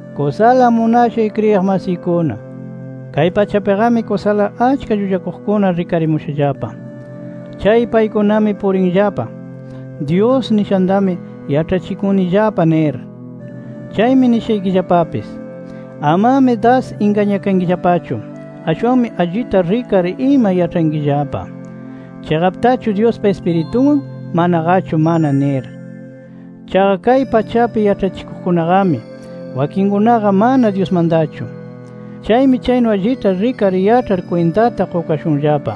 Kusala munashay kriyiq masiykuna, kay pachapiqami kusala achka llullakuqkuna rikarimushallapa. Chay paykunami purinllapa Dyus nishantami yaĉhachikunillapa nir. Chaymi nishaykillapapis: Amami das ingañakankillapachu. Ashwanmi allita rikar ima yaĉhankillapa, chiqaptachu Dyuspa Ispiritunwan, manaqachu mana nir. Chaqa kay pachapi yaĉhachikuqkunaqami, wakinkunaqa mana Dyusmantachu. Chaymi chaynu allita rikar yaĉhar kwintata qukashunllapa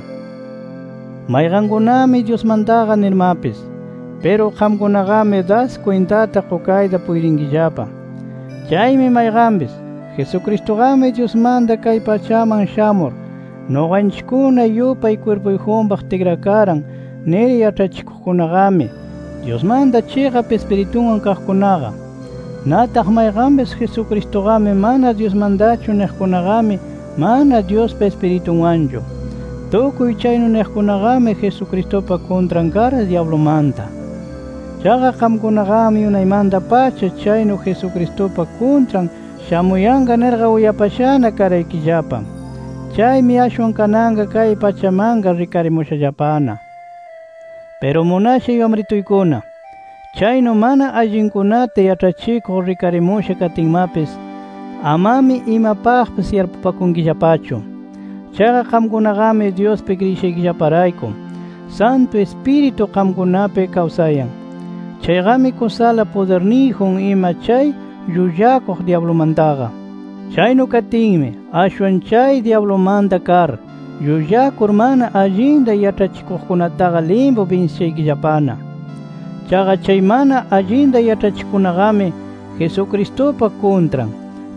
mayqankunami Dyusmantaqa nirmapis. Piru qamkunaqami das kwintata qukayta puytinkillapa. Chaymi mayqanpis, Jesucristuqami Dyusmanta kay pachaman shamur, nuqanchikkuna yupay kwirpuyjunpaq tikrakaran nir yaĉhachikuqkunaqami, Dyusmanta chiqap Ispirituwan kaqkunaqa. Nataq mayqanpis, Jesucristuqami mana Dyusmantachu niqkunaqami, mana Dyuspa Ispiritunwanchu. Tukuy chaynu niqkunaqami Jesucristupa kuntran kar, dyablumanta. Chaqa qamkunaqami unaymanta-pacha chaynu Jesucristupa kuntran shamuyanqa nirqa uyapashana karaykillapa. Chaymi ashwan kananqa kay pachamanqa rikarimushallapana. Piru munashay wamrituykuna, chaynu mana allinkunata yaĉhachikuq rikarimusha katinmapis, amami imapaqpis yarpupakunkillapachu. Chaqa qamkunaqami Dyuspi kriyishaykillaparayku, Santu Ispiritu qamkunapi kawsayan, chayqami kusala pudirniyjun ima chay llullakuq dyablumantaqa. Chaynu katinmi ashwan chay dyablumanta kar, llullakur mana allinta yaĉhachikuqkunataqa limpu binsishaykillapana. Chaqa chay mana allinta yaĉhachikuqkunaqami, Jesucristupa kuntran.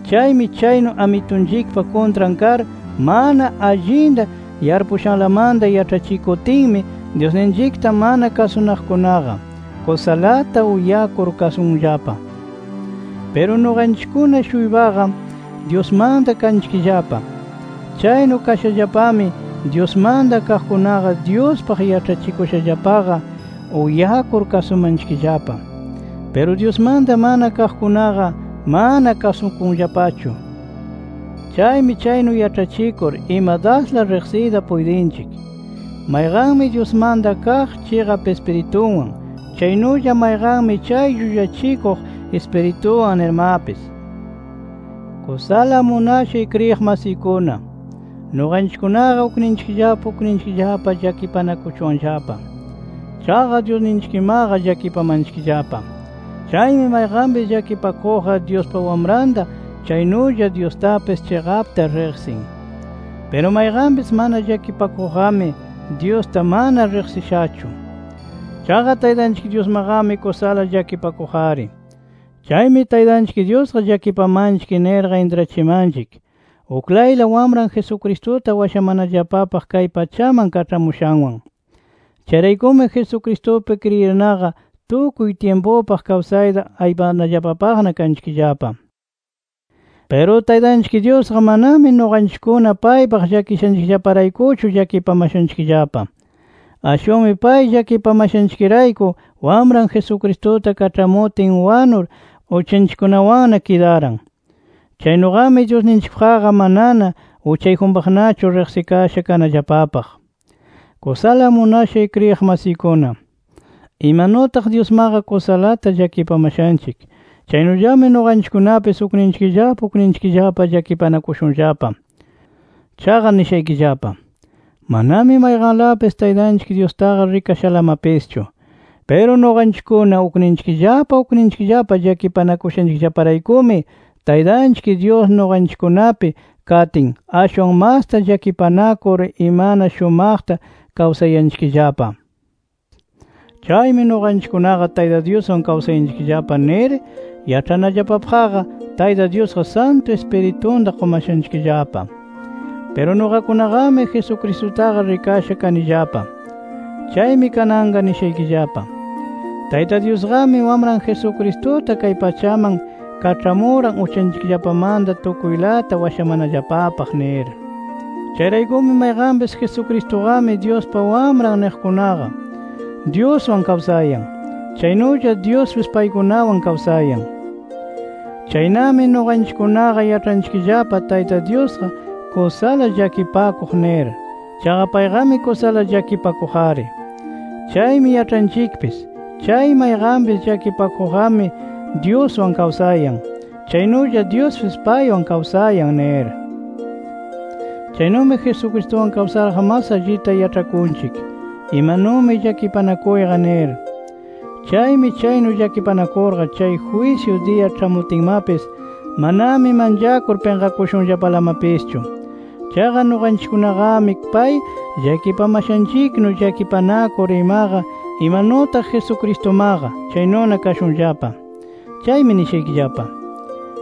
Chaymi chaynu Amitunchikpa kuntran kar, mana allinta yarpushanlamanta yaĉhachikutinmi Dyusninchikta mana kasunaqkunaqa, kusalata uyakur kasunllapa. Piru nuqanchikkuna-shuypaqa Dyusmanta kanchikllapa. Chaynu kashallapami Dyusmanta kaqkunaqa Dyuspaq yaĉhachikushallapaqa uyakur kasumanchikllapa. Piru Dyusmanta mana kaqkunaqa, mana kasukunllapachu. Chaymi chaynu yaĉhachikur ima dasla riqsiyta puytinchik, mayqanmi Dyusmanta kaq chiqap Ispirituwan, chaynulla mayqanmi chay llullachikuq ispirituwan nirmapis. Kusala munashay kriyiq masiykuna, nuqanchikkunaqa ukninchikllapa ukninchikllapa llakipanakuchuwanllapa. Chaqa Dyusninchikmaqa llakipamanchikllapa. Chaymi mayqanpis llakipakuqqa Dyuspa Wamranta, chaynulla Dyustapis chiqapta riqsin. Piru mayqanpis mana llakipakuqqami Dyusta mana riqsishachu. Chaqa Taytanchik Dyusmaqami kusala llakipakuq-ari. Chaymi Taytanchik Dyusqa llakipamanchik nirqa intrachimanchik uklayla Wamran Jesucristuta washamanallapapaq kay pachaman kaĉhamushanwan. Chayraykumi Jesucristupi kriyirnaqa tukuy tyimpupaq kawsayta aypanallapapaqna kanchikllapa. Piru Taytanchik Dyusqa manami nuqanchikkuna paypaq llakishanchikllaparaykuchu llakipamashanchikllapa. Ashwanmi pay llakipamashanchikrayku, Wamran Jesucristuta kaĉhamutin wanur, uchanchikkunawanna kidaran. Chaynuqami Dyusninchikpaqqa manana uchayjunpaqnachu riqsikasha kanallapapaq. Kusala munashay kriyiq masiykuna, imanutaq Dyusmaqa kusalata llakipamashanchik, chaynullami nuqanchikkunapis ukninchikllapa ukninchikllapa llakipanakushunllapa. Chaqa nishaykillapa: Manami mayqanlapis Taytanchik Dyustaqa rikashalamapischu. Piru nuqanchikkuna ukninchikllapa ukninchikllapa llakipanakushanchikllaparaykumi, Taytanchik Dyus nuqanchikkunapi katin, ashwan masta llakipanakur imana shumaqta kawsayanchikllapa. Chaymi nuqanchikkunaqa Tayta Dyuswan kawsayanchikllapa nir yaĉhanallapapaqqa, Tayta Dyusqa Santu Ispiritunta qumashanchikllapa. Piru nuqakunaqami, Jesucristutaqa rikasha kanillapa. Chaymi kananqa nishaykillapa: Tayta Dyusqami Wamran Jesucristuta kay pachaman kaĉhamuran, uchanchikllapamanta tukuylata washamanallapapaq nir. Chayraykumi mayqanpis, Jesucristuqami Dyuspa Wamran niqkunaqa Dyuswan kawsayan, chaynulla Dyuspis paykunawan kawsayan. Chaynami nuqanchikkunaqa yaĉhanchikllapa Tayta Dyusqa kusala llakipakuq nir. Chaqa payqami kusala llakipakuq-ari. Chaymi yaĉhanchikpis chay mayqanpis llakipakuqqami Dyuswan kawsayan, chaynulla Dyuspis paywan kawsayan nir. Chaynumi Jesucristuwan kawsarqa mas allita yaĉhakunchik imanumi llakipanakuyqa nir. Chaymi chaynu llakipanakurqa chay jwisyu diya ĉhamutinmapis manami manchakur pinqakushunllapalamapischu. Chaqa nuqanchikkunaqami pay llakipamashanchiknu, llakipanakur imaqa imanutaq Jesucristumaqa, chaynuna kashunllapa. Chaymi nishaykillapa: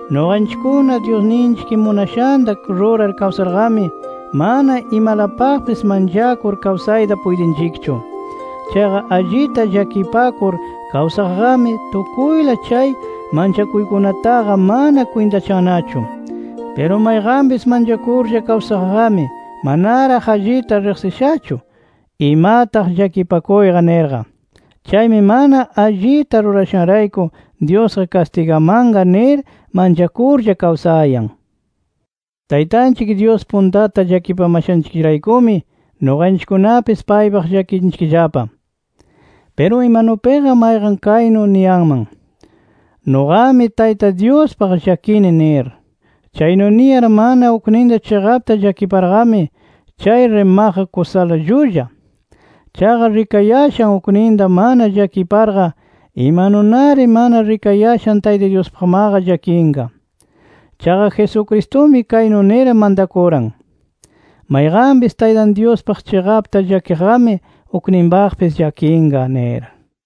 Nuqanchikkuna Dyusninchik munashanta rurar kawsarqami, mana imalapaqpis manchakur kawsayta puytinchikchu. Chaqa allita llakipakur kawsaqqami, tukuyla chay manchakuykunataqa mana kwintachannachu. Piru mayqanpis manchakurlla kawsaqqami manaraq allita riqsishachu, imataq llakipakuyqa nirqa. Chaymi mana allita rurashanrayku Dyusqa kastigamanqa nir manchakurlla kawsayan. Taytanchik Dyus puntata llakipamashanchikllaparaykumi, nuqanchikkunapis paypaq llakinchikllapa. Piru imanupiqa mayqan kaynu niyanman: Nuqami Tayta Dyuspaq llakini nir. Chaynu niyar mana ukninta chiqapta llakiparqami, chay rimaqqa kusala llulla. Chaqa rikayashan ukninta mana llakiparqa, imanunari mana rikayashan Tayta Dyuspaqmaqa llakinqa. Chaqa Jesucristumi kaynu nir mantakuran: “Mayqanpis Taytay Dyuspaq chiqapta llakiqqami, ukninpaqpis llakinqa” nir.